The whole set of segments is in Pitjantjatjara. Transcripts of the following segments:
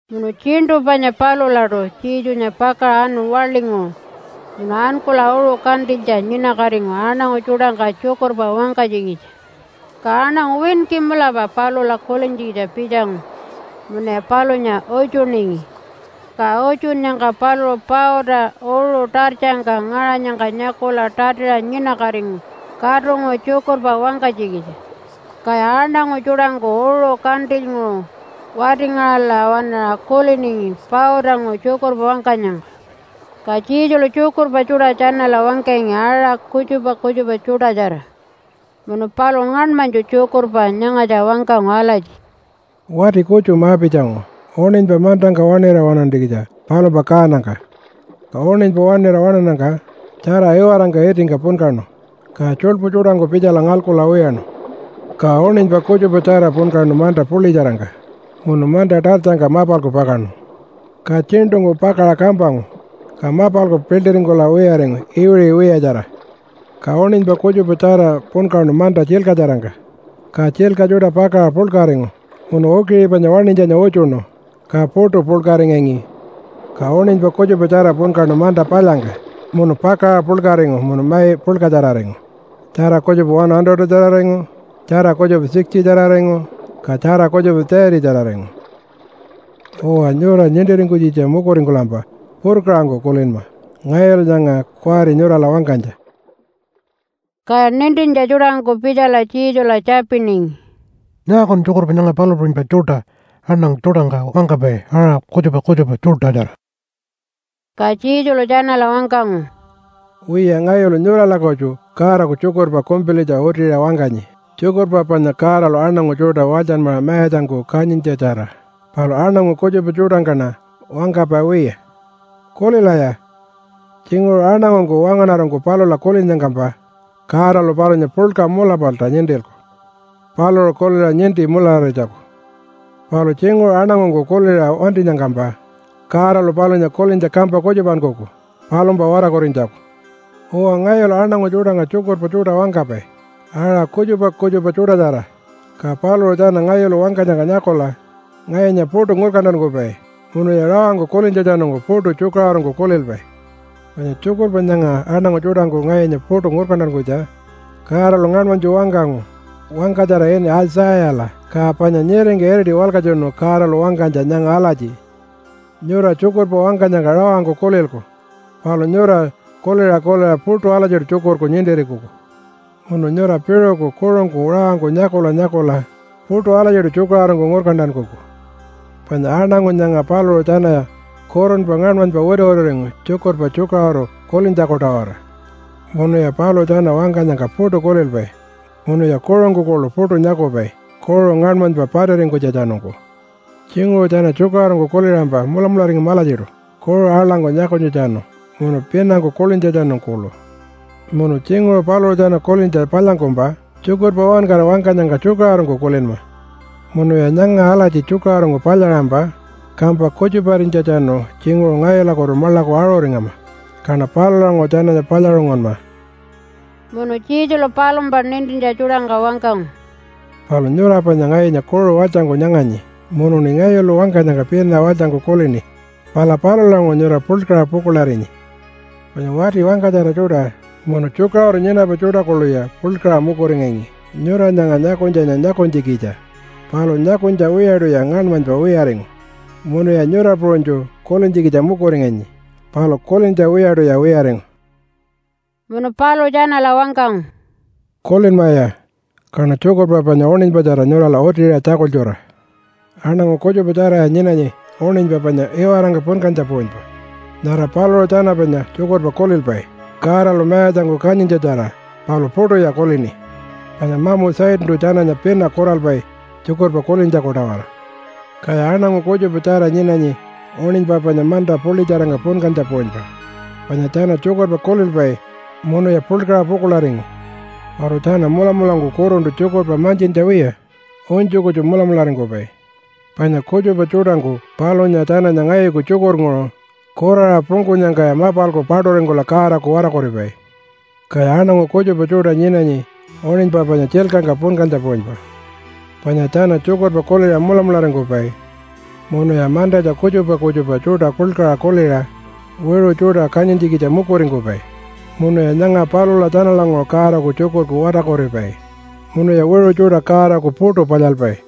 Munu tjiṉṯu panya palulaṯu Jesunya pakaṟa anu waḻinguṟu munu ankula uṟu kantilytja nyinakatingu aṉangu tjuṯangka tjukurpa wangkanytjikitja. Ka aṉangu winki mulapa palula kulintjikitja pitjangu munuya palunya utjuningi. Ka utjunnyangka paluṟu pauta uṟu tartjangka ngaṟanyangka nyakula tatiṟa nyinakatingu katunguṟu tjukurpa wangkanytjikitja. Kaya aṉangu tjuṯangku uṟu kantilynguṟu wati-ngaṟala waṉaṟa kuliningi pautanguṟu tjukurpa wangkanyangka. Ka Jesulu tjukurpa tjuṯa tjanala wangkangi aṟa kutjupa kutjupa tjuṯatjara, munu paluṟu ngaṉmanytju tjukurpa nyangatja wangkangu alatji, “Wati kutju ma-pitjangu uṉinypa mantangka waṉira waṉantjikitja palumpa kaanangka. Ka uṉinypa waṉira waṉannyangka tjara iwarangka itingka punkaṉu, ka tjuḻpu tjuṯangku pitjala ngalkula wiyaṉu. Ka uṉinypa kutjupatjara punkaṉu manta puḻitjarangka munu manta tartjangka mapalku pakaṉu. Ka tjiṉṯungku pakaṟa kampangu, ka mapalku piḻṯiringkula wiyaringu iwiṟi wiyatjara. Ka uṉinypa kutjupatjara punkaṉu manta tjilkatjarangka, ka tjilka tjuṯa pakaṟa puḻkaringu munu ukiṟi panya waṉinytjanya utjuṉu, ka puṯu puḻkaringangi. Ka uṉinypa kutjupatjara punkaṉu manta palyangka munu pakaṟa puḻkaringu munu mai puḻkatjararingu, tjara kutjupa 100-tjararingu, tjara kutjupa 60-tjararingu, ka tjara kutjupa 30-tjararingu. “Uwa, nyura nintiringkunytjikitja mukuringkulampa purkaṟangku kulinma ngayulu nyanga kuwari nyurala wangkanytja.” Kaya nintintja tjuṯangku pitjala Jesula tjapiningi, “Nyaakun tjukurpa nyanga palu puṟunypa tjuṯa aṉangu tjuṯangka wangkapai aṟa kutjupa kutjupa tjuṯatjara?” Ka Jesulu tjanala wangkangu, “Wiya, ngayulu nyurala kutju Godaku tjukurpa kumpilitja utiṟa wangkanyi, tjukurpa panya Godalu aṉangu tjuṯa walytjanmaṟa mayatjangku kanyintjatjara. Palu aṉangu kutjupa tjuṯangkaṉa wangkapai wiya. Kulilaya! Tjinguṟu aṉangungku wangaṉarangku palula kulinnyangkampa, Godalu palunya puḻka mulapalta nintilku paluṟu kuliṟa ninti mulararinytjaku. Palu tjinguṟu aṉangungku kuliṟa wantinyangkampa, Godalu palunya kulintja kampa kutjupankuku palumpa watarkurinytjaku. Uwa, ngayulu aṉangu tjuṯangka tjukurpa tjuṯa wangkapai aṟa kutjupa kutjupa tjuṯatjara, ka paluṟu tjana ngayulu wangkanyangka nyakula ngayunya puṯu ngurkantankupai munuya rawangku kulintjatjanungku puṯu tjukaṟurungku kulilpai. Panya tjukurpa nyanga aṉangu tjuṯangku ngayunya puṯu ngurkantankunytja Godalu ngaṉmanytju wangkangu wangkatjara ini Aitjayala, ka panya nyiringka iriti walkatjunu Godalu wangkanytja nyanga alatji, ‘Nyura tjukurpa wangkanyangka rawangku kulilku, palu nyura kuliṟa kuliṟa puṯu alatjiṯu tjukurku nintiringkuku. Munu nyura piṟuku kuṟungku rawangku nyakula nyakula puṯu alatjiṯu tjukaṟurungku ngurkantankuku. Panya aṉangu nyanga paluṟu tjanaya kurunpa ngaṉmanypa wituwituringu tjukurpa tjukaṟuru kulintjaku-tawara. Munuya paluṟu tjana wangkanyangka puṯu kulilpai, munuya kuṟungku kuḻu puṯu nyakupai kuṟu ngaṉmanypa patiringkunytjatjanungku. Tjinguṟu tjana tjukaṟurungku kuliṟampa mulamularingama alatjiṯu kuṟu aḻangku nyakunytjatjanu, munu pinangku kulintjatjanu kuḻu. Munu tjinguṟu paluṟu tjana kulintja palyangkumpa tjukurpa uwankara wangkanyangka tjukaṟurungku kulinma. Munuya nyanga alatji tjukaṟurungku palyaṟampa, kampa kutjuparinytjatjanu tjinguṟu ngayulakutu maḻaku aṟuringama. Kaṉa palulanguṟu tjananya palyaṟungunma.’” Munu Jesulu palumpa nintintja tjuṯangka wangkangu, “Palu nyura panya ngayunya kuṟu walytjangku nyanganyi, munuṉi ngayulu wangkanyangka pina walytjangku kulini. Pala palulanguṟu nyura puḻkaṟa pukuḻarinyi. Panya wati wangkatjara tjuṯa munu tjukaṟuru nyinapai tjuṯa kuḻuya puḻkaṟa mukuringangi nyura nyanga nyakunytjanya nyakunytjikitja, palu nyakunytja wiyaṯuya ngaṉmanypa wiyaringu. Munuya nyura puṟunytju kulintjikitja mukuringangi palu kulintja wiyaṯuya wiyaringu.” Munu paluṟu tjanala wangkangu, “Kulinmaya, kaṉa tjukurpa panya uṉinypatjara nyurala utiṟa tjakultjura! Aṉangu kutjupa tjaraya nyinanyi uṉinypa panya iwarangka punkantja puṟunypa. Nyara paluṟu tjana panya tjukurpa kulilpai Godalu mayatjangku kanyintjatjara palu puṯuya kulini, panya mamu Satantu tjananya pina kuralpai tjukurpa kulintjaku-tawara. Kaya aṉangu kutjupatjara nyinanyi uṉinypa panya manta puḻitjarangka punkantja puṟunypa. Panya tjana tjukurpa kulilpai munuya puḻkaṟa pukuḻaringu. Palu tjana mulamulangku kuruntu tjukurpa mantjintja wiya unytju kutju mulamularingkupai. Panya kutjupa tjuṯangku palunya tjananya ngayuku tjukurnguṟu kuraṟa pungkunyangkaya mapalku paṯuringkula Godaku watarkuripai. Kaya aṉangu kutjupa tjuṯa nyinanyi uṉinypa panya tjilkangka punkantja puṟunypa, panya tjana tjukurpa kuliṟa mulamularingkupai. Munuya mantatja kutjupa kutjupa tjuṯa puḻkaṟa kuliṟa wiṟu tjuṯa kanyintjikitja mukuringkupai munuya nyanga palula tjanalanguṟu Godaku tjukurku watarkuripai munuya wiṟu tjuṯa Godaku puṯu palyalpai.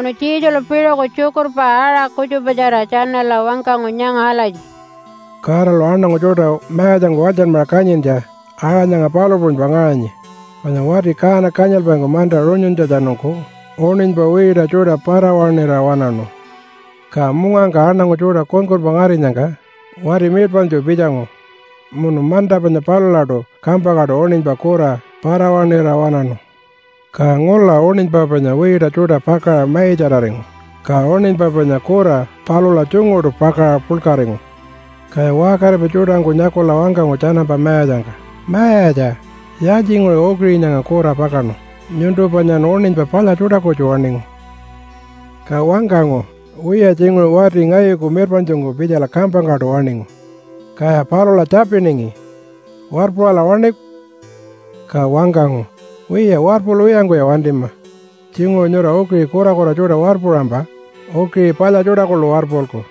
Munu Jesulu piṟuku tjukurpa aṟa kutjupatjara tjanala wangkangu nyanga alatji, “Godalu aṉangu tjuṯa mayatjangku walytjanmaṟa kanyintja aṟa nyanga palu puṟunypa ngaṟanyi, panya wati kaana kanyilpaingku manta runyuntjatjanungku uṉinypa wiita tjuṯa para-waṉira waṉaṉu. Ka mungangka aṉangu tjuṯa kunkunpa ngarinyangka wati mirpaṉtju pitjangu munu manta panya palulaṯu kampangkaṯu uṉinypa kura para-waṉira waṉaṉu. Ka ngula uṉinypa panya wiita tjuṯa pakaṟa maitjararingu, ka uṉinypa panya kura palula tjunguṯu pakaṟa puḻkaringu. Kaya waṟkaripai tjuṯangku nyakula wangkangu tjanampa mayatjangka, ‘Mayatja! Yaaltjinguṟu ukiṟi nyanga kura pakaṉu? Nyuntu panyan uṉinypa palya tjuṯa kutju waṉingu.’ “Ka wangkangu, ‘Wiya, tjinguṟu wati ngayuku mirpaṉtjungku pitjala kampangkaṯu waṉingu.’ “Kaya palula tjapiningi, ‘Warpuṟala waṉiku?’ Ka wangkangu, ‘Wiya, warpulwiyangkuya wantima! Tjinguṟu nyura ukiṟi kurakura tjuṯa warpuṟampa ukiṟi palya tjuṯa kuḻu warpulku.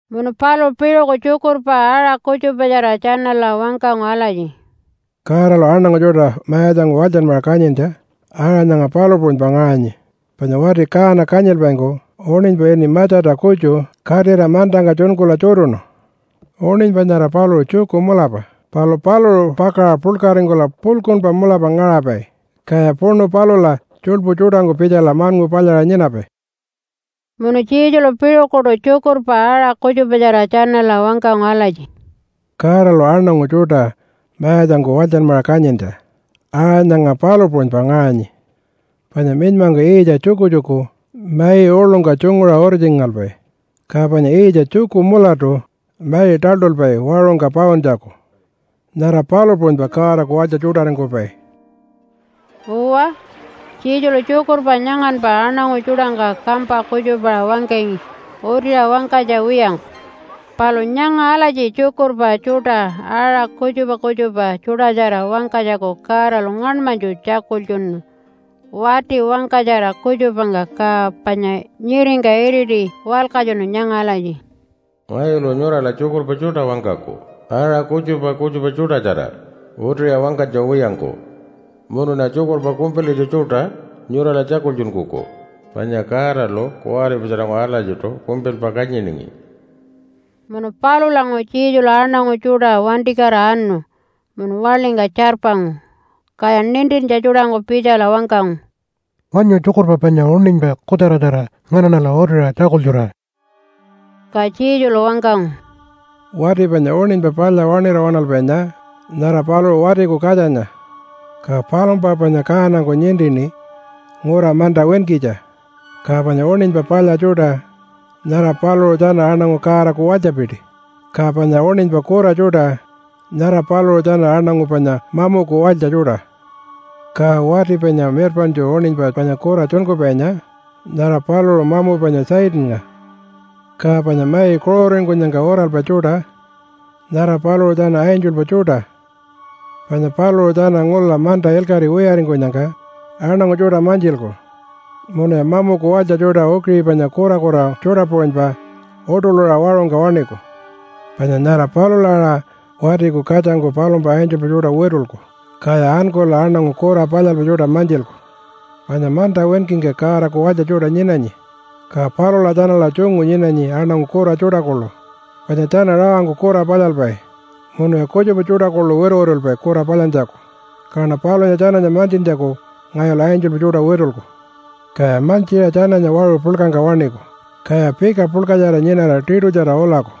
Munu paluṟu piṟuku tjukurpa aṟa kutjupatjara tjanala wangkangu alatji, “Godalu aṉangu tjuṯa mayatjangku walytjanmaṟa kanyintja aṟa nyanga palu puṟunypa ngaṟanyi, panya wati kaana kanyilpaingku uṉinypa ini matjata kutju katira mantangka tjunkula tjutuṉu. Uṉinypa nyara paluṟu tjuku mulapa palu paluṟu pakaṟa puḻkaringkula puḻkuṉpa mulapa ngaṟapai. Kaya puṉu palula tjuḻpu tjuṯangku pitjala maṉngu palyaṟa nyinapai.” Tjukurpa Yiitjatjara Munu Jesulu piṟukuṯu tjukurpa aṟa kutjupatjara tjanala wangkangu alatji, “Godalu aṉangu tjuṯa mayatjangku walytjanmaṟa kanyintja aṟa nyanga palu puṟunypa ngaṟanyi, panya minymangku yiitja tjukutjuku mai uḻungka tjunguṟa uritjingalpai, ka panya yiitja tjuku mulatu mai taḻṯulpai waṟungka pauntjaku. Nyara palu puṟunypa Godaku walytja tjuṯaringkupai.” Uwa, Jesulu tjukurpa nyanganpa aṉangu tjuṯangka kampa kutjupaṟa wangkangi utiṟa wangkanytja wiyangku. Palu nyanga alatji tjukurpa tjuṯa aṟa kutjupa kutjupa tjuṯatjara wangkanytjaku Godalu ngaṉmanytju tjakultjunu wati wangkatjara kutjupangka ka panya nyiringka iriti walkatjunu nyanga alatji, “Ngayulu nyurala tjukurpa tjuṯa wangkaku aṟa kutjupa kutjupa tjuṯatjara utiṟa wangkanytja wiyangku. Munuṉa tjukurpa kumpilitja tjuṯa nyurala tjakultjunkuku, panya Godalu kuwaripatjaranguṟu alatjiṯu kumpilpa kanyiningi.” Munu palulanguṟu Jesulu aṉangu tjuṯa wantikatira anu munu waḻingka tjarpangu. Kaya nintintja tjuṯangku pitjala wangkangu, “Wanyu tjukurpa panya uṉinypa kutjaratjara nganaṉala utiṟa tjakultjura.” Ka Jesulu wangkangu, “Wati panya uṉinypa palya waṉira waṉalpainya, nyara paluṟu Watiku Katjanya. Ka palumpa panya kaanangku nintini ngura manta winkitja. Ka panya uṉinypa palya tjuṯa, nyara paluṟu tjana aṉangu Godaku walytjapiti. Ka panya uṉinypa kura tjuṯa, nyara paluṟu tjana aṉangu panya mamuku walytja tjuṯa. Ka wati panya mirpaṉtju uṉinypa panya kura tjunkupainya, nyara paluṟu mamu panya Satannga. Ka panya mai kuṟuringkunyangka uralpai tjuṯa, nyara paluṟu tjana angelpa tjuṯa, panya paluṟu tjana ngula manta ilkaṟi wiyaringkunyangka aṉangu tjuṯa mantjilku. Munuya mamuku walytja tjuṯa ukiṟi panya kurakura tjuṯa puṟunypa uṯuḻura waṟungka waṉiku. Panya nyara palula aṟa Watiku Katjangku palumpa angelpa tjuṯa witulku, kaya ankula aṉangu kura palyalpai tjuṯa mantjilku. Panya manta winkingka Godaku walytja tjuṯa nyinanyi, ka palula tjanala tjungu nyinanyi aṉangu kura tjuṯa kuḻu panya tjana rawangku kura palyalpai munuya kutjupa tjuṯa kuḻu wituwitulpai kura palyantjaku. Kaṉa palunya tjananya mantjintjaku ngayulu angelpa tjuṯa witulku. Kaya mantjiṟa tjananya waṟu puḻkangka waṉiku, kaya pika puḻkatjara nyinara tiṯutjara ulaku.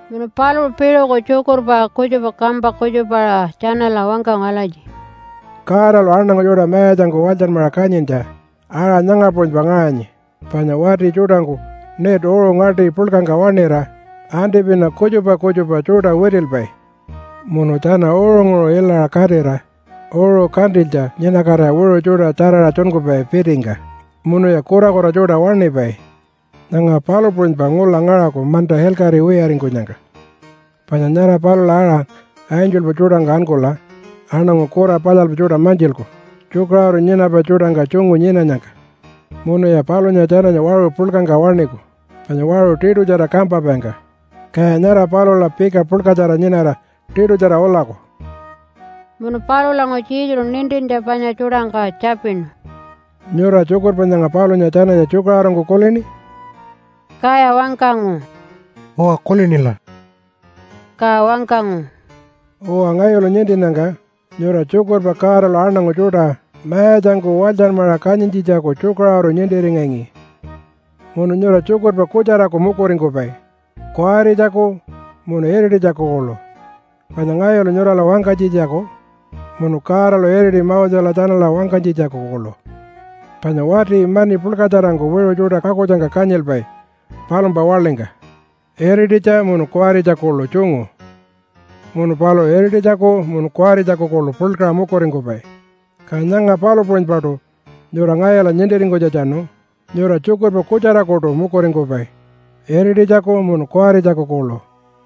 Munu paluṟu piṟuku tjukurpa kutjupa kampa kutjupaṟa tjanala wangkangu alatji, “Godalu aṉangu tjuṯa mayatjangku walytjanmaṟa kanyintja aṟa nyanga puṟunypa ngaṟanyi, panya wati tjuṯangku net uṟu ngaṯi puḻkangka waṉira antipina kutjupa kutjupa tjuṯa witilpai. Munu tjana uṟunguṟu ilaṟa katira uṟu kantilytja nyinakatira wiṟu tjuṯa tjaraṟa tjunkupai pitingka munuya kurakura tjuṯa waṉipai. Nyanga palu puṟunypa ngula ngaṟaku manta ilkaṟi wiyaringkunyangka, panya nyara palula aṟa angelpa tjuṯangku ankula aṉangu kura palyalpai tjuṯa mantjilku tjukaṟuru nyinapai tjuṯangka tjungu nyinanyangka. Munuya palunya tjananya waṟu puḻkangka waṉiku panya waṟu tiṯutjara kampapaingka, kaya nyara palula pika puḻkatjara nyinara tiṯutjara ulaku.” Munu palulanguṟu Jesulu nintintja panya tjuṯangka tjapinu, “Nyura tjukurpa nyanga palunya tjananya tjukaṟurungku kulini?” Kaya wangkangu, “Uwa, kulinila.” Ka wangkangu, “Uwa, ngayulu nintinnyangka nyura tjukurpa Godalu aṉangu tjuṯa mayatjangku walytjanmaṟa kanyintjitjaku tjukaṟuru nintiringangi. Munu nyura tjukurpa kutjaraku mukuringkupai, kuwaritjaku munu irititjaku kuḻu, panya ngayulu nyurala wangkanytjitjaku munu Godalu iriti Mosela tjanala wangkanytjitjaku kuḻu. Panya wati mani puḻkatjarangku wiṟu tjuṯa pakutjangka kanyilpai palumpa waḻingka, irititja munu kuwaritja kuḻu tjungu. Munu paluṟu irititjaku munu kuwaritjaku kuḻu puḻkaṟa mukuringkupai. Ka nyanga palu puṟunypaṯu nyura ngayula nintiringkunytjatjanu nyura tjukurpa kutjarakuṯu mukuringkupai irititjaku munu kuwaritjaku kuḻu.”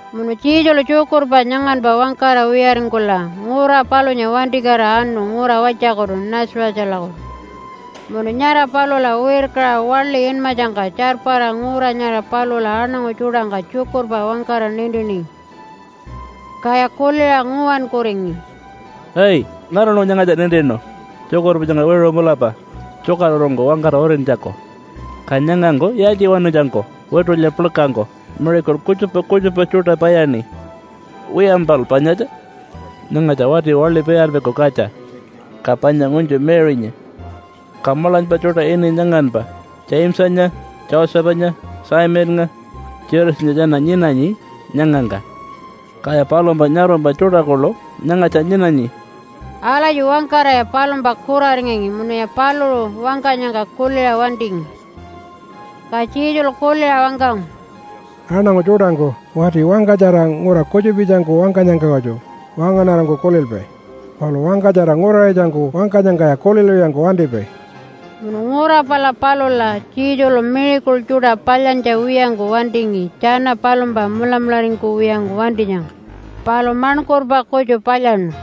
Munu Jesulu tjukurpa nyanganpa wangkara wiyaringkula ngura palunya wantikatira anu ngura walytjakutu Nazarethalakutu. Munu nyara palula wirkaṟa waḻi inmatjangka tjarpara ngura nyara palula aṉangu tjuṯangka tjukurpa wangkara nintiningi. Kaya kuliṟa nguwankuringi, “Ai! Nganalu nyangatja nintinu tjukurpa nyanga wiṟu mulapa tjukaṟurungku wangkara utintjaku? Ka nyangangku yaaltjiwanutjangku witulya puḻkangku miracle kutjupa kutjupa tjuṯa palyaṉi? Wiyampal panyatja, nyangatja wati waḻi palyalpaiku katja, ka panya ngunytju Mary-nya, ka maḻanypa tjuṯa ini nyanganpa Jamesanya, Josephanya, Simonnga, Judasanya tjana nyinanyi nyangangka. Kaya palumpa nyarumpa tjuṯa kuḻu nyangatja nyinanyi.” Alatji wangkaraya palumpa kuraringangi munuya paluṟu wangkanyangka kuliṟa wantingi. Ka Jesulu kuliṟa wangkangu, “Aṉangu tjuṯangku wati wangkatjara ngura kutjupitjangku wangkanyangka kutju wangaṉarangku kulilpai, palu wangkatjara nguraṟitjangku wangkanyangkaya kulilwiyangku wantipai.” Munu ngura pala palula Jesulu miracle tjuṯa palyantja wiyangku wantingi tjana palumpa mulamularingkuwiyangku wantinyangka, palu maṉkurpa kutju palyaṉu.